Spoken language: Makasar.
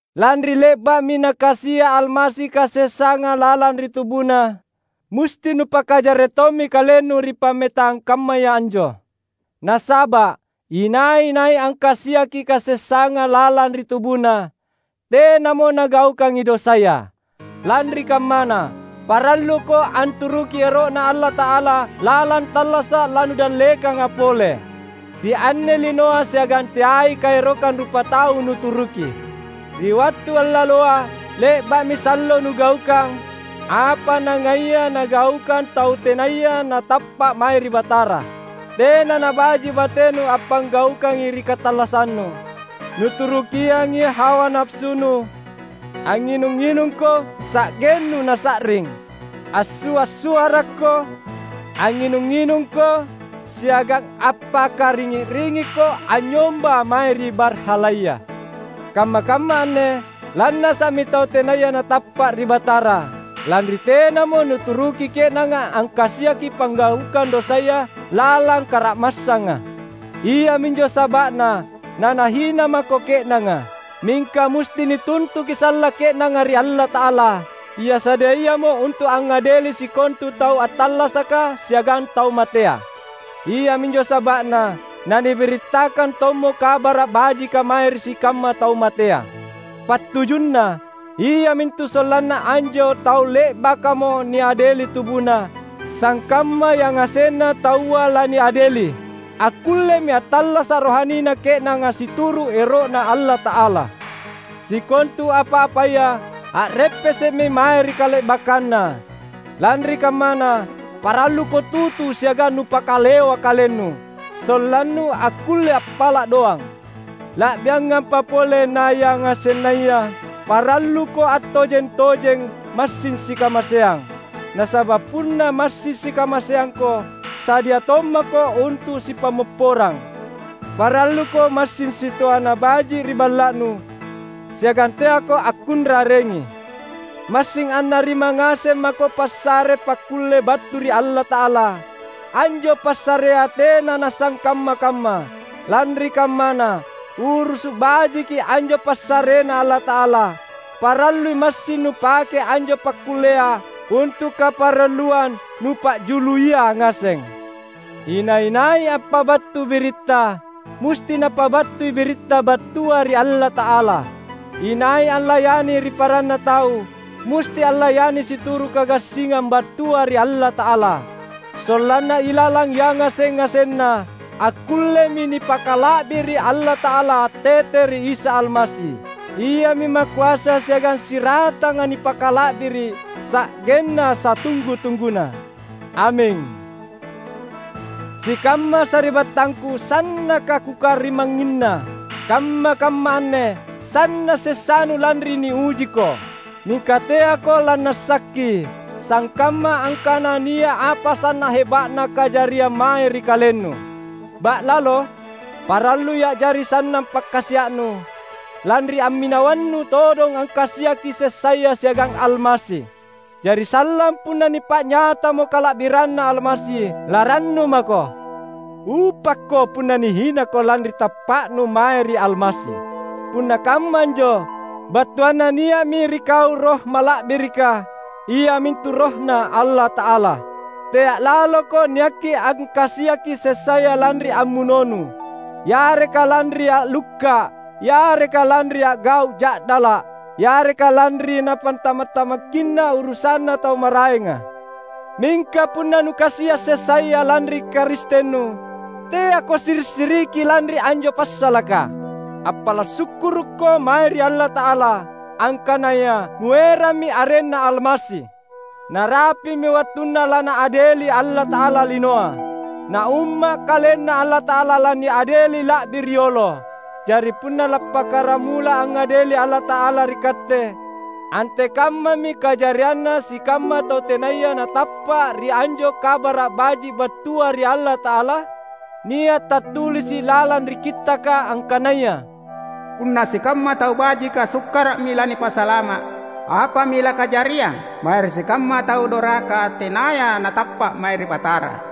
Lanri le’ba’mi Nakasia’ Almasi kasessanga lalang ri TubuNa, musti nupakajarre’ tommi kalennu ri pammetang kammaya anjo. Nasaba’ inai-nai angkasiaki kasessanga lalang ri tubuna, tenamo nagaukangi dosaya. Lanri kammana, paralluko anturuki ero’Na Allata’ala lalang tallasa’ lanudallekanga pole, ri anne linoa siagang teai kaerokang rupatau nuturuki. Ri wattu allaloa, le’ba’mi sallo nugaukang apa nangaia nagaukang tau tenaya natappa’ mae ri Batara. Tena nabaji’ batenu appanggaukang ri katallassannu. Nuturukiangi hawa napasunu, angnginung-nginungko sa’gennu nasa’ring, assua’-suarakko, angnginung-nginungko siagang appakaringi’-ringikko anynyomba mae ri barhalaya. Kamma-kamma anne lannasa’mi tau tenaya natappa’ ri Batara, lanri tenamo nuturuki ke’nanga angkasiaki panggaukang dosaya lalang kara’massanga. Iaminjo saba’na nanahina mako ke’nanga. Mingka musti nituntuki sallang ke’nanga ri Allata’ala, Ia sadiayamo untu’ angngadeli sikontu tau attallasaka siagang tau matea. Iaminjo saba’na nanibirittakang tommo Kabara’ Bajika mae ri sikamma tau matea. Pattujunna iamintu sollanna anjo tau le’bakamo niadeli tubuna — sangkamma yangasenna taua laniadeli — akkullemi attallasa’ rohanina ke’nanga situru’ ero’Na Allata’ala. Sikontu apa-apaya a’reppese’mi mae ri kale’bakkanna; lanri kammana paralluko tutu siagang nupakalewa kalennu, sollannu akkulle appala’ doang. La’biangampa pole nayangasennaya, paralluko attojeng-tojeng massing sikamaseang; nasaba’ punna massing sikamaseangko sadia tommako untu’ sipammopporang. Paralluko massing sitoana baji’ ri balla’nu, siagang teako akkunrarengi. Massing annarima ngaseng mako passare pakkulle battu ri Allata’ala; anjo passarea tena nasangkamma-kamma. Lanri kammana, urusu’ bajiki anjo passareNa Allata’ala; parallui massing nupake anjo pakkullea untu’ kaparalluang nupa’juluia ngaseng. Inai-nai appabattu biritta, musti napabattui biritta battua ri Allata’ala; inai allayani ri paranna tau, musti allayani situru’ kagassingang battua ri Allata’ala; sollanna ilalang yangaseng-ngasenna, akkullemi nipakala’biri’ Allata’ala tete ri Isa Almasi. Iami Makoasa siagang siratanga nipakala’biri’ sa’genna satunggu-tungguna. Aming. Sikamma sari’battangku, sannaka kukarimangnginna! Kamma-kamma anne sanna’ sessanu lanri niujiko. Mingka teako lannasakki, sangkamma angkana nia’ apa sanna’ heba’na kajariang mae ri kalennu. Ba’lalo, parallui a’jari sannang pakkasia’nu lanri amminawannu todong angkasiaki sessaya siagang Almasi. Jari sallang, punna nipa’nyatamo kala’biranNa Almasi, larannu mako. Upakko punna nihinako lanri tappa’nu mae ri Almasi. Punna kamma anjo, battuanna nia’mi ri kau Roh Mala’birika, iamintu RohNa Allata’ala. Tea’ laloko niakki angkasiaki sessaya lanri ammunonu, yareka lanri a’lukka’, yareka lanri a’gau’ ja’dala’, yareka lanri napantama’-tamakkinna urusanna tau maraenga. Mingka punna nukasia’ sessaya lanri Karistennu, teako siri’-siriki lanri anjo passalaka. Appala’ sukkurukko mae ri Allata’ala, angkanaya nuerammi arenNa Almasi. Narapi’mi wattunna laNaadeli Allata’ala linoa. Na Umma’ KalenNa Allata’ala laniadeli la’bi riolo. Jari punna lappakkaramula angngadeli Allata’ala ri katte, antekammami kajarianna sikamma tau tenaya natappa’ ri anjo Kabara’ Baji’ battua ri Allata’ala? Nia’ tattulisi’ lalang ri Kittaka angkanaya, "Punna sikamma tau bajika sukkara’mi lanipasalama’, apami lakajariang mae ri sikamma tau doraka tenaya natappa’ mae ri Batara!"